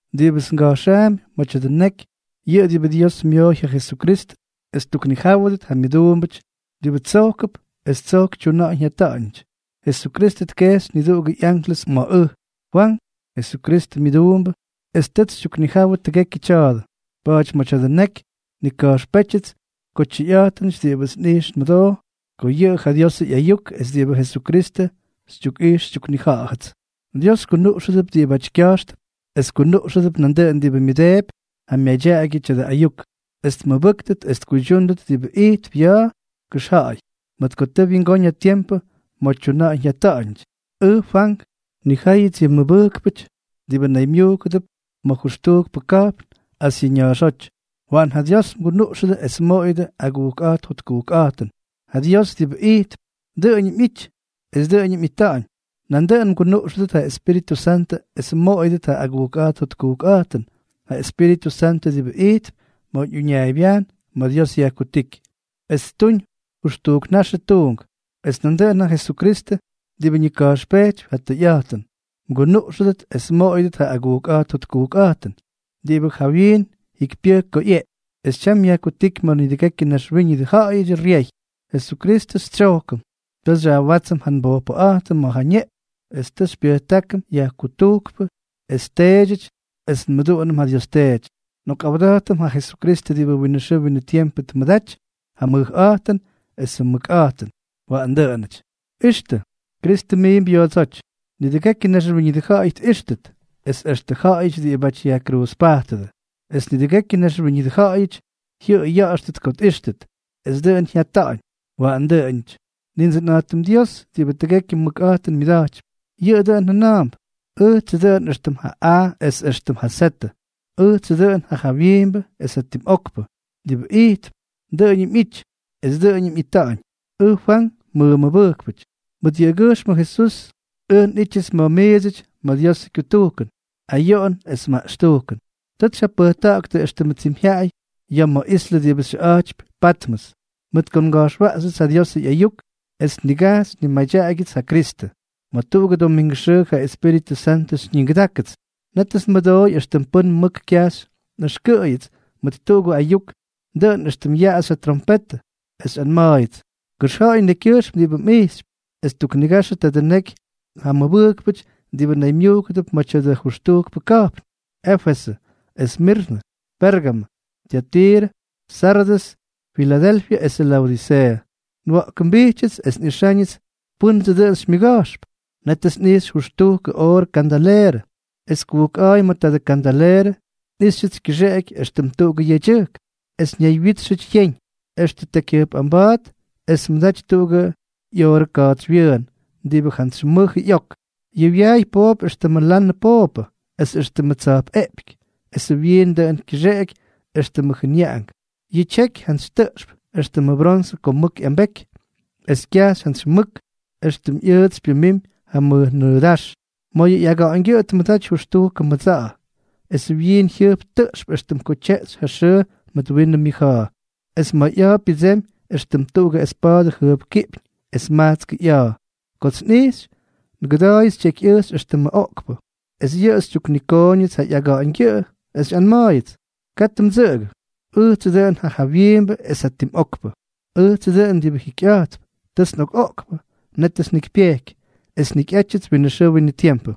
Diꞌibʉts ngʉxjaapy ma̱ tya̱dʉ neky, yʉꞌʉ diꞌibʉ Dios myooy ja Jesukristʉ es ttuknijáwʉdʉt ja myʉduumbʉty diꞌibʉ tsojkʉp es tsojk tyuna̱ꞌa̱ñ jyata̱ꞌa̱ñʉty. Jesukristʉ tkejxy niduꞌugʉ ꞌyanklʉs ma̱ ʉj, Fwank, Jesukristʉ myʉduumbʉ, es tʉts xytyuknijawʉ tʉgekyʉ tya̱a̱dʉ. Pa̱a̱ty ma̱ tya̱dʉ neky nnika̱jxpétyʉts ko tyʉyꞌa̱jtʉnʉty diꞌibʉts nꞌijx nmʉdoo, ko yʉꞌʉ ja Diosʉ ꞌyayuk es diꞌibʉ Jesukristʉ xytyukꞌijx xytyuknija̱ꞌa̱jʉts. Dios kunuꞌxʉdʉp diꞌibʉty kya̱jxtʉp, es kunuꞌxʉdʉp nandʉꞌʉn diꞌibʉ myʉdeepy ja myadyaꞌagyʉ tya̱dʉ ayuk, es tmʉbʉ́ktʉt es tkuydyúndʉt diꞌibʉ ijtp ya̱a̱ kʉxja̱ꞌa̱y, mʉt ko tʉ wyingóñ ja tiempʉ ma̱ tyuna̱ꞌa̱ñ jyata̱ꞌa̱ñʉty. Ʉj Fwank. Nnijáyʉts yʉ mʉbʉjkpʉty diꞌibʉ naymyujkʉdʉp ma̱ jʉxtujkpʉ ka̱jpn Asyʉ ña̱a̱xóty. Waꞌan ja Dios mgunuꞌxʉdʉ es mmoꞌoyʉdʉ ja agujkꞌa̱jt jotkujkꞌa̱jtʉn, ja Dios diꞌibʉ ijtp, dʉꞌʉñʉm ꞌyity, es dʉꞌʉñʉm ꞌyita̱ꞌa̱ñ. Nandʉꞌʉn mgunuꞌxʉdʉt ja Espíritʉ Santʉ es mmoꞌoyʉdʉt ja agujkꞌa̱jt jotkujkꞌa̱jtʉn, ja Espíritʉ Santʉ diꞌibʉ ijtp ma̱ uñaaybyajn ma̱ Dios yajkutíky, es ttuñ jʉxtujk naxʉ tuunk. Es nandʉꞌʉn ja Jesukristʉ, diꞌibʉ ñika̱jxpejtypy ja tʉyꞌa̱jtʉn, mgunuꞌxʉdʉt es mmoꞌoyʉdʉt ja agujkꞌa̱jt jotkujkꞌa̱jtʉn, diꞌibʉ jawyiin jikypyʉjk ko ꞌyeꞌky, es tyam yajkutíky ma̱ nidʉgekyʉ naxwíñʉdʉ ja̱ꞌa̱yʉdyʉ ryey. Jesukristʉ xytsyojkʉm, tʉ xyajwátsʉm ja nbojpʉꞌa̱jtʉm mʉt ja ñeꞌpyñ, es tʉ xypyʉjtákʉm yajkutujkpʉ es teedyʉty, es nmʉduꞌunʉm ja Dios Teety. ¡Nꞌokꞌawda̱jtʉm ja Jesukristʉ diꞌibʉ winʉ xʉʉ winʉ tiempʉ tmʉdaty ja mʉjꞌa̱jtʉn esʉ mʉkꞌa̱jtʉn! Waꞌan dʉꞌʉnʉty. Ixtʉ, Kristʉ miimp yoodsóty. Nidʉgekyʉ naxwíñʉdʉ ja̱ꞌa̱y tꞌíxtʉt, es extʉ jaꞌajʉty diꞌibáty yajkruuzpajtʉdʉ; es nidʉgekyʉ naxwíñʉdʉ ja̱ꞌa̱yʉty jyʉꞌʉy ya̱ꞌa̱xtʉt ko tꞌíxtʉt. Es dʉꞌʉn jyata̱ꞌa̱ñ. Waꞌan dʉꞌʉnʉty. Nindsʉnꞌa̱jtʉm Dios, diꞌibʉ tʉgekyʉ mʉkꞌa̱jtʉn myʉda̱jtypy, yʉꞌʉ dʉꞌʉn jʉna̱a̱mp: “Ʉjtsʉ dʉꞌʉn éxtʉm ja A es éxtʉm ja Z, ʉjtsʉ dʉꞌʉn ja jawyiimbʉ es ja tim okpʉ, diꞌibʉ ijtp, dʉꞌʉñʉm ꞌyity, es dʉꞌʉñʉm ꞌyita̱ꞌa̱ñ.” Ʉj Fwank, mmʉmʉbʉjkpʉty. Mʉt yʉꞌʉgyʉjxmʉ Jesús ʉj nꞌítyʉts mʉt miidsʉty ma̱ Diosʉ kyutujkʉn, ayoꞌon es maꞌxtujkʉn. Tʉts xyjapʉjta̱ꞌa̱ktʉ éxtʉmʉ tsimyjyaꞌay ya̱ ma̱ islʉ diꞌibʉ xyʉꞌa̱jtypy Patmʉs, mʉt ko nga̱jxwaꞌxyʉts ja Diosʉ ꞌyayuk es nnigajxy nnimadyaꞌagyʉts ja Kristʉ. Ma̱ tuꞌugʉ domingʉ xʉʉ ja Espíritʉ Santʉ xyñigʉdákʉts. Nétʉts nmʉdooy éxtʉm pʉ́n mʉk kyajxy nꞌʉxkʉꞌʉyʉts mʉt tuꞌugʉ ayuk, dʉꞌʉn éxtʉm yaꞌaxy ja trompetʉ, es xyꞌanma̱a̱yʉts: —Kʉxja̱ꞌa̱y nekykyʉjxm diꞌibʉ mꞌijxypy, es tuknigaxʉ tadʉ neky ja mʉbʉjkpʉty diꞌibʉ naymyujkʉdʉp ma̱ tya̱dʉ jʉxtujkpʉ ka̱jpn: Éfesʉ, Esmirnʉ, Pérgamʉ, Tyatiirʉ, Sardʉs, Filadelfyʉ esʉ Laodiseeʉ. Nwa̱ꞌkʉmbijtyʉts es nꞌixa̱ꞌa̱ñʉts pʉ́ndsʉ dʉn xymyʉga̱jxp. Nétʉts nꞌijxy jʉxtujkʉ oorʉ kandaleerʉ, es kujkꞌa̱a̱y ma̱ tadʉ kandaleerʉ, nꞌijxyʉts kyʉxeꞌeky éxtʉm tuꞌugʉ yedyʉjk, es ñaywyítxʉty yeñ, extʉ tekyjyʉjpꞌamba̱a̱t, es tmʉdaty tuꞌugʉ ꞌyoorʉ ka̱a̱tsywyʉʉn diꞌibʉ jantsy mʉjʉ ꞌyok. Yʉ wyaay poop éxtʉmʉ lanʉ pooppʉ, es éxtʉmʉ tsa̱jpꞌeꞌpyky, esʉ wyiin dʉꞌʉn kyʉxeꞌeky éxtʉmʉ jʉnyaꞌangʉn. Yʉ tyeky jantsy tʉꞌxp, éxtʉmʉ bronsʉ ko mʉk ꞌyambeky; esʉ kyajxy jantsy mʉk, éxtʉm ꞌyʉʉtsy pyʉmimy ja mʉj nʉʉdáx. Ma̱ yʉ ꞌyaga̱ꞌa̱ñgyʉꞌʉ tmʉdaty jʉxtujkʉ mʉdsa̱ꞌa̱, esʉ wyiin jyʉjp tʉꞌxp éxtʉm ko tyeꞌxy ja xʉʉ mʉt winʉ myʉja̱a̱. Es ma̱ ꞌya̱a̱ pyʉdsemy éxtʉm tuꞌugʉ espa̱a̱dʉ jʉjpkiꞌpyñ es majtskʉ ꞌya̱a̱. Kots nꞌijxy, ngʉda̱a̱yʉts tyekyꞌʉjxy éxtʉmʉ oꞌkpʉ. Es yʉꞌʉ tyuknikooñʉts ja ꞌyaga̱ꞌa̱ñgyʉꞌʉ, es xyꞌanma̱a̱yʉts: —Katʉ mdsʉꞌʉgʉ. Ʉjtsʉ dʉꞌʉn ja jawyiimbʉ es ja tim okpʉ. Ʉjtsʉ dʉꞌʉn diꞌibʉ jikyꞌa̱jtp. Tʉts nꞌokꞌoꞌkpʉ, nétʉts njikypyejky, es njikyꞌátyʉts winʉ xʉʉ winʉ tiempʉ,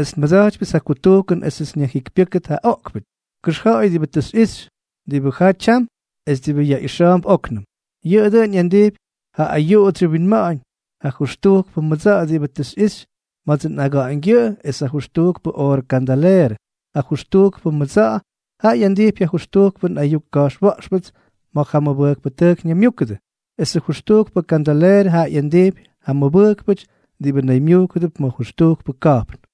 es nmʉda̱jtypyʉts ja kutujkʉn esʉts nyajjikypyʉ́kʉt ja oꞌkpʉty. Kʉxja̱ꞌa̱y diꞌibʉ tʉ xyꞌixy, diꞌibʉ jaa tyam, es diꞌibʉ yaꞌixa̱a̱mp óknʉm. Yʉꞌʉ dʉꞌʉn ꞌyandijpy ja ayuꞌudsyʉ winma̱ꞌa̱ñ, ja jʉxtujkpʉ mʉdsa̱ꞌa̱ diꞌibʉ tʉ xyꞌixy ma̱dsʉ nꞌaga̱ꞌa̱ñgyʉꞌʉ es ja jʉxtujkpʉ oorʉ kandaleerʉ. Ja jʉxtujkpʉ mʉdsa̱ꞌa̱ jaꞌa ꞌyandijpy ja jʉxtujkpʉ nꞌayuk ka̱jxwa̱ꞌxpʉts ma̱ ja mʉbʉjkpʉtʉjk ñaymyúkʉdʉ, esʉ jʉxtujkpʉ kandaleerʉ jaꞌa ꞌyandijpy ja mʉbʉjkpʉty diꞌibʉ naymyujkʉdʉp ma̱ jʉxtujkpʉ ka̱jpn.